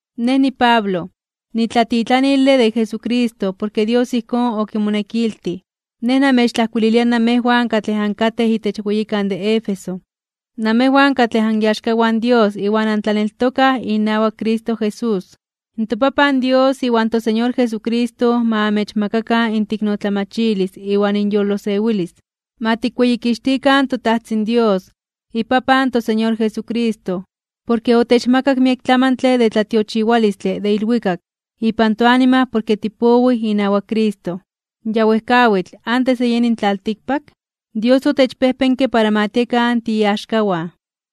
Nej niPablo, nitlatitlanile de Jesucristo porke Dios ijkón okimonekiltij. Nej namechtlajkuililia namejwan katlej ankatej itech weyikan de Éfeso, namejwan katlej aniaxkawan in Dios iwan antlaneltokaj inawak Cristo Jesús. ToPapan Dios iwan toSeñor Jesucristo ma amechmakakan inteiknotlamachilis iwan inyolosewilis. Ma tikweyikixtikan toTajtzin Dios, iPapan in toSeñor Jesucristo, porke otechmakak miek tlamantle de tlatiochiwalistle de ilwikak ipan toanima porke tipowij inawak Cristo. Ya wejkawitl, antes de yeni in tlaltikpak, Dios otechpejpenke para ma tiekan tiiaxkawan.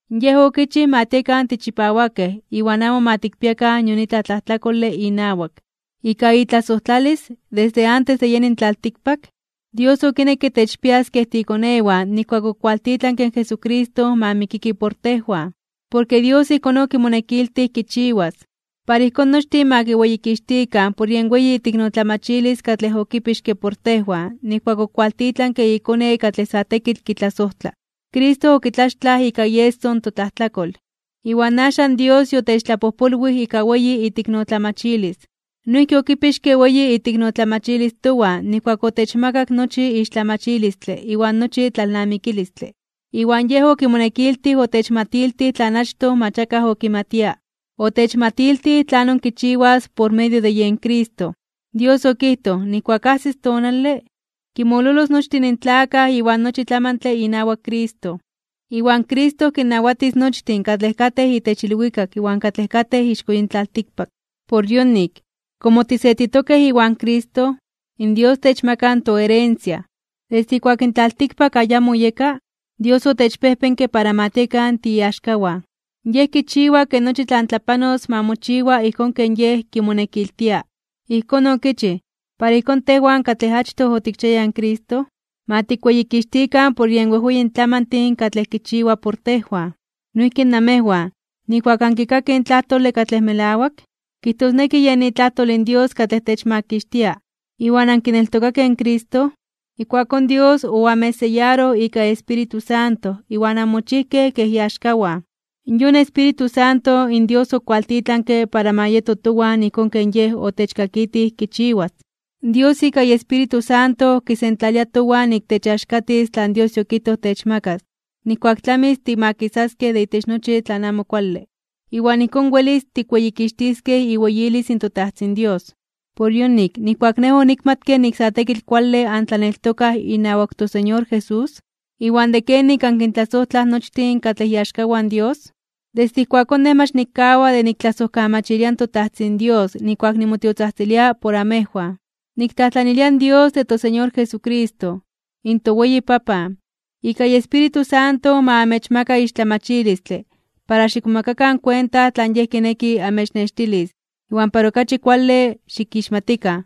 Yej okichij ma tiekan tichipawakej iwan amo ma tikpiakan nion itlaj tlajtlakole inawak. Ika itlasojtlalis, desde antes de yeni in tlaltikpak, Dios okinekke techpias kej tiikonewan nijkuak okualtitlanke in Jesucristo ma mikiki por tejwan, porke Dios ijkón okimonekiltij kichiwas. Para ijkón nochtin ma kiweyikixtikan por yen weyi iteiknotlamachilis katlej okipixke por tejwan nijkuak okualtitlanke iKone katlej sa tekitl kitlasojtla. Cristo okitlaxtlaj ika ieso in totlajtlakol, iwan axan Dios yotechtlapojpolwij ika weyi iteiknotlamachilis. Noijki okipixke weyi iteiknotlamachilis towan nijkuak otechmakak nochi ixtlamachilistle iwan nochi tlalnamikilistle. Iwan Yej okimonekiltij otechmatiltij tlan achtoj mach akaj okimatia. Otechmatiltij tlanon kichiwas por medio de Cristo. Dios okijtoj nijkuak ajsis tonale, kinmololos nochtin in tlakaj iwan nochi tlamantle inawak Cristo. Iwan Cristo kinnawatis nochtin katlej katej itech ilwikak iwan katlej katej ixko yin tlaltikpak. Por yonik, komo tisetitokej iwan Cristo, in Dios techmaka toherencia. Desde ijkuak in tlaltikpak ayamo oyeka, Dios otechpejpenke para ma tiekan tiiaxkawan. Yej kichiwa ke nochi tlan tlapanos ma mochiwa ijkón ken Yej kimonekiltia. Ijkón okichij, para ijkón tejwan katlej achtoj otikchiayaj in Cristo, ma tikweyikixtikan por yen wejweyin tlamantin katlej kichiwa por tejwan. Noijki namejwan, nijkuak ankikakej in tlajtole katlej melawak, kijtosneki yen itlajtol in Dios katlej techmakixtia, iwan ankineltokakej in Cristo, ijkuakón Dios oamechseyaroj ika iEspíritu Santo iwan anmochijkej kej iaxkawan. Yon Espíritu Santo in Dios okiwaltitlanke para ma yeto towan ijkón ken Yej otechkakitij kichiwas. Dios ika iEspíritu Santo kisentlalia towan nik techaxkatis tlan Dios yokijtoj techmakas nijkuak tlamis timakisaskej de itech nochi tlan amo kuale. Iwan ijkón welis tikweyikixtiskej iweyilis in toTajtzin Dios. Por yonik, nijkuak nej onikmatke nik sa tekitl kuale antlaneltokaj inawak in toSeñor Jesús, iwan de kenik ankintlasojtlaj nochtin katlej iaxkawan in Dios, desde ijkuakón nej mach nikkawa de niktlasojkamachilia in toTajtzin Dios nijkuak nimotiotzajtzilia por amejwan. Niktlajtlanilia in Dios de toSeñor Jesucristo, in toweyi Papan, ika iEspíritu Santo ma amechmaka ixtlamachilistle para xikmomakakan kuenta tlan Yej kineki amechnextilis iwan para okachi kuale xikixmatikan.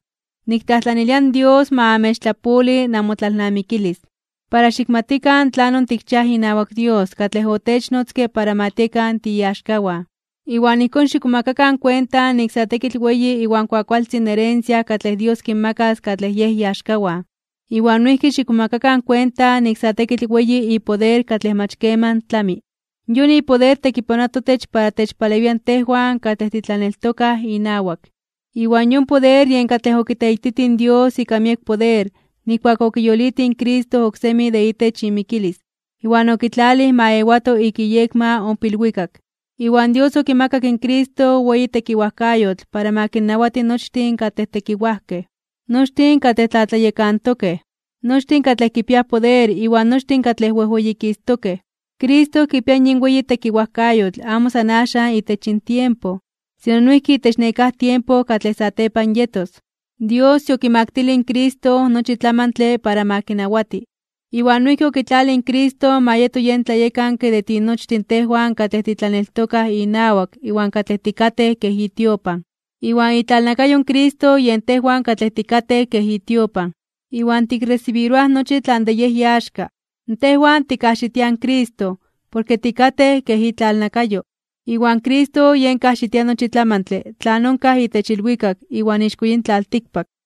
Niktlajtlanilia in Dios ma amechtlapoli namotlalnamikilis, para xikmatikan tlanon tikchiaj inawak Dios katlej otechnotzke para ma tiekan tiiaxkawan. Iwan ijkón xikmomakakan kuenta nik sa tekitl weyi iwan kuakualtzin in herencia katlej Dios kinmakas katlej Yej iaxkawan. Iwan noijki xikmomakakan kuenta nik sa tekitl weyi ipoder katlej mach keman tlami. Yon ipoder tekipanoa totech para techpalewia tejwan katlej titlaneltokaj inawak. Iwan yon ipoder yen katlej okiteititij in Dios ika miek poder nijkuak okiyolitij in Cristo oksemi de itech imikilis iwan okitlalij ma ewato ik iyekma ompa ilwikak. Iwan Dios okimakak in Cristo weyi tekiwajkayotl para ma kinnawati nochtin katlej tekiwajkej, nochtin katlej tlatlayekantokej, nochtin katlej kipiaj poder iwan nochtin katlej wejweyikistokej (wejweyititokej). Cristo kipia yin weyi tekiwajkayotl amo san axan itech yin tiempo, sino noijki itech nekáj tiempo katlej satepan yetos. Dios yokimaktilij in Cristo nochi tlamantle para ma kinawati, iwan noijki okitlalij in Cristo ma yeto yen tlayekanke de tinochtin tejwan katlej titlaneltokaj inawak iwan katlej tikatej kej itiopan. Iwan itlalnakayo in Cristo yen tejwan katlej tikatej kej itiopan, iwan tikresibiroaj nochi tlan de Yej iaxka. Tejwan tikajxitiaj in Cristo porke tikatej kej itlalnakayo, iwan Cristo yen kajxitia nochi tlamantle tlan onkaj itech ilwikak iwan ixko yin tlaltikpak.